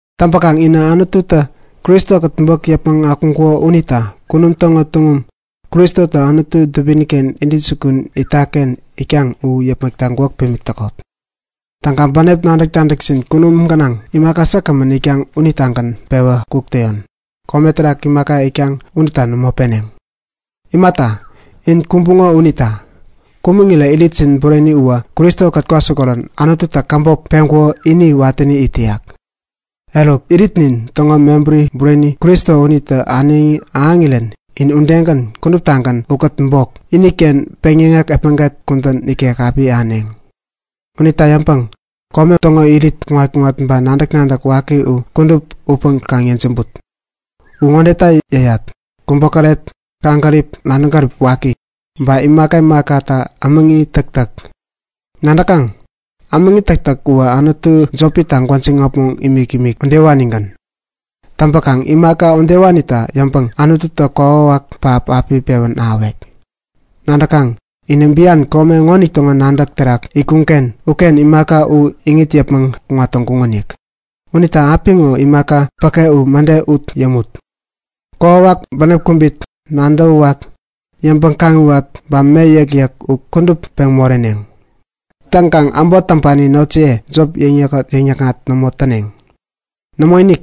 Täŋpäkaŋ inä Anututä Kristo-kät bok yäpmäŋ akuŋkuko unita kunum täŋo tuŋum, Kristotä Anutu dubini-ken intäjukun itak-ken itkaŋ u yäpmäkta gwäk pimik täkot. Täŋkaŋ bänep nadäk-nadäkjin kunum gänaŋ imaka säkgämän itkaŋ unitagän pewä kuk täyon, kome terak imaka itkaŋ uterak nämo peneŋ. Imata, in kumbuŋo unita. Kumäŋirä iritjin bureni uwä Kristo-kät kwasikorirän Anututä käbop peŋkuko ini watäni it täyak. Eruk, iritnin täŋo mebäri bureni Kristo unitä äneŋi ahäŋirän in udegän kuduptagän ukät bok, iniken peŋyäŋek epmäget kudän ikek api ahäneŋ. Unita yäŋpäŋ kome täŋo irit kuŋat-kuŋat ba nadäk-nadäk waki u kudup utpäŋ kaŋ yejämbut! U ŋodeta yäyat; Kubokäret, kaŋgärip nadäŋ gärip waki, ba imaka imakata ämäŋi täktäk. Nadäkaŋ? Ämäŋi täktäk uwä anutu jopita gwäjiŋ äpmoŋ imik-imik udewanigän. Täŋpäkaŋ imaka udewanita yäŋpäŋ Anututä kokwawak pähap api pewän ahäwek. Nadäkaŋ, inä bian kome ŋonitäŋo nadäk terak itkuŋ-ken uken imaka u iŋit yäpmäŋ kuŋat täŋkuŋonik. Unita apiŋo imaka päke u mäde ut yämut. Kokwawak, bänep kubit, nadäwäwak, yäŋpäŋ-kaŋiwat ba me yäkyäk u kudup peŋ moreneŋ. Täŋkaŋ äbot täŋpani notjiye jop yäkŋat-yäkŋat nämo täneŋ. Nämoinik,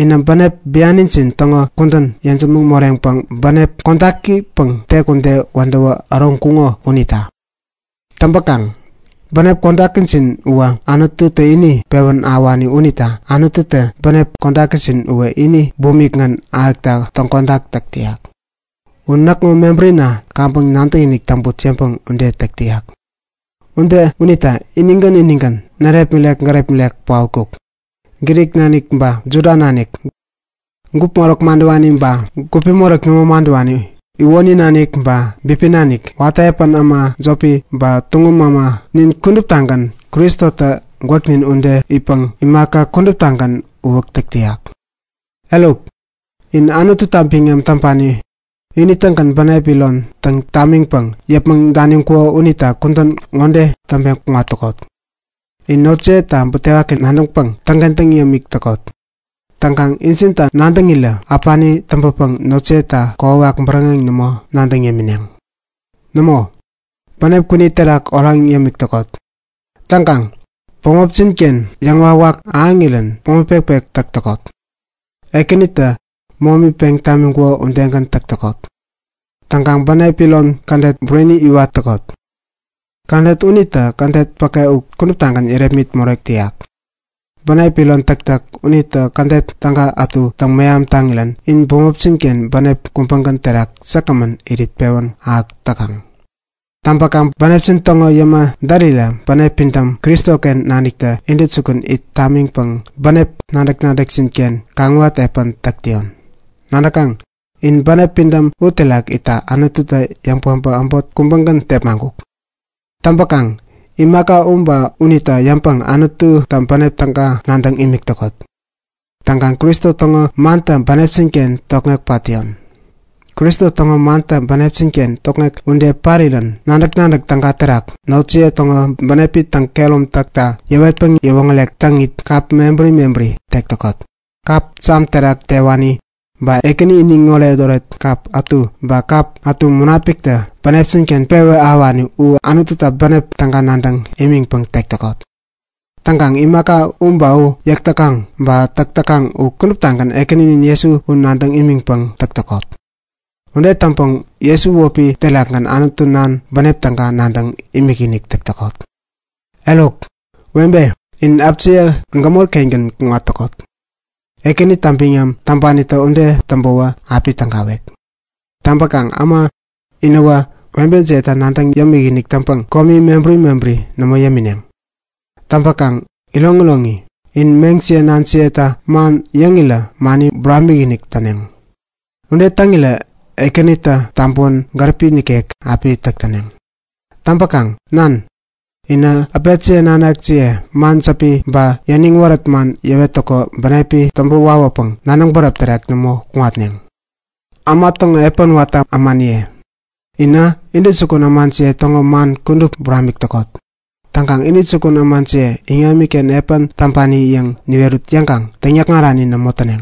inä bänep bianijin täŋo kudän yejämäŋ moreŋpäŋ bänep kodakipäŋ tek ude wädäwä äroŋkuŋo unita. Täŋpäkaŋ bänep kodakijin uwä Anututä ini pewän ahäwani unita Anututä bänep kodakijin uwä ini bumikgän ahäkta täŋkodak täk täyak. U näkŋo mebärina kaŋpäŋ nadäkinik täŋput yäŋpäŋ ude täk täyak. Ude unita inigän inigän, närepmirek-gärepmirek paotkuk. Grik nanik ba Juda nanik, gupi moräk madäwani ba gupi moräk nämo madäwani, iwoni nanik ba bipi nanik, watä epän äma jopi ba tuŋum äma, nin kuduptagän Kristotä gwäknin ude itpäŋ imaka kuduptagän uwäk täk täyak. Eruk, in Anututa biŋam täŋpani, ini-tägän bänep iron täŋ tamiŋpäŋ yäpmäŋ daniŋkuko unita kudän ŋode täŋpeŋ kuŋat täkot; In notjiyeta butewaki nadäŋpäŋ täŋkentäŋ yämik täkot. Täŋkaŋ injinta nadäŋirä äpani täŋpäpäŋ notjiyeta kokwawak bäräŋeŋ nämo nadäŋ yämineŋ. Nämo, bänep kwini terak oraŋ yämik täkot. Täŋkaŋ bämopjin-ken yäŋwawak ahäŋirän momi pekpek täk täkot. Ekänitä momi peŋ tamiŋkuko udegän täk täkot. Täŋkaŋ bänep iron kädet bureni iwat täkot. Kädet unitä kädet päke u kuduptagän yärepmit morek täyak. Bänep iron täktäk unitä kädet täga ätu täŋ-meham taŋirän in bämopjin-ken bänep kubägän terak säkgämän irit pewän ahäk täkaŋ. Täŋpäkaŋ bänepjin täŋo yäma därirä bänep pidäm Kristoken naniktä intäjukun it tamiŋpäŋ bänep nadäk-nadäkjin-ken kaŋiwat epän täk täyon. Nadäkaŋ? In bänep pidäm uterak itta Anututä yäŋ-päbä äbot kubägän tepmaŋkuk. Täŋpäkaŋ imaka u ba unita yäŋpäŋ Anututa bänep täga nadäŋ imik täkot. Täŋkaŋ Kristo täŋo mantä bänepjin-ken tokŋek pat täyon. Kristo täŋo mantä bänepjin-ken tokŋek ude parirän nadäk-nadäk täga terak notjiye täŋo bänepi täŋkehärom takta yäwetpäŋ yäwoŋärek täŋit kap mebäri mebäri tek täkot. Kap Sam terak tewani, ba Ekäni iniŋ oretoret kap ätu ba kap ätu Munapiktä bänepjin-ken pewän ahäwani u Anututa bänep täga nadäŋ imiŋpäŋ tek täkot. Täŋkaŋ imaka u ba u yäk täkaŋ ba täk täkaŋ u kuduptagän Ekäninin Jesu u nadäŋ imiŋpäŋ täk täkot. Ude täŋpäŋ Jesu wäpi terakgän Anutu Nan bänep täga nadäŋ imikinik täk täkot. Eruk, webe, in äpjiye gämori-kengän kuŋat täkot. Ekänita biŋam täŋpanitä ude täŋpäwä api tägawek. Täŋpäkaŋ äma, inäwä webejiyeta nadäŋ yämikinik täŋpäŋ komi mebäri mebäri nämo yämineŋ. Täŋpäkaŋ iroŋiroŋi, inä meŋjiye nanjiyetä man yäŋirä mani buramik-inik täneŋ. Ude täŋirä Ekänitä tabäwän gäripi nikek api täk täneŋ. Täŋpäkaŋ nan, inä äpetjiye nanakjiye man jäpi ba yäniŋ wärät man yäwettäko bänepi täŋpä wawäpäŋ nadäŋ bäräp terak nämo kuŋatneŋ. Äma täŋo epän watä ämaniye, inä intäjukun ämajiye täŋo man kudup buramik täkot. Täŋkaŋ intäjukun ämajiye iŋamiken epän täŋpani yäŋ niwerut yäŋkaŋ täŋyäkŋarani nämo täneŋ.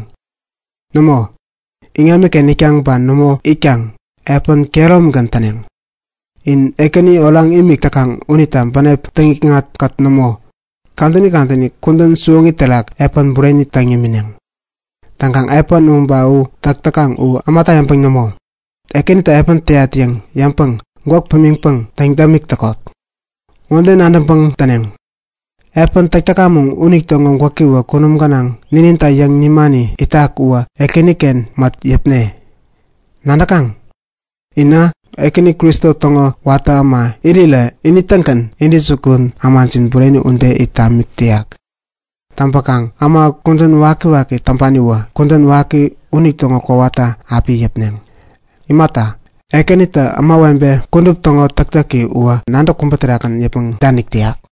Nämo, iŋamiken itkaŋ ba nämo itkaŋ, epän kehäromigän täneŋ. In Ekäni oraŋ imik täkaŋ unita bänep täŋikŋat-kät nämo, kadäni kadäni kudän siwoŋi terak epän bureni täŋ yämineŋ. Täŋkaŋ epän u ba u täk täkaŋ u ämata yäŋpäŋ nämo, Ekänita epän täyat yäŋ yäŋpäŋ gwäk pimiŋpäŋ täŋ-dämik täkot. Ŋode nadäŋpäŋ täneŋ; Epän täk täkamäŋ unitäŋo gwäkiwä kunum gänaŋ nininta yäŋ nimani itak uwä Ekäniken mät yäpne. Nadäkaŋ? Inä Ekäni Kristo täŋo watä äma irirä ini-tägän intäjukun ämajin bureni ude it tamik täyak. Täŋpäkaŋ äma kudän wakiwaki täŋpaniwä kudän waki unitäŋo kowata api yäpneŋ. Imata, Ekänitä ämawebe kudup täŋo täktäki uwä nadäk kubä terakgän yäpmäŋ danik täyak.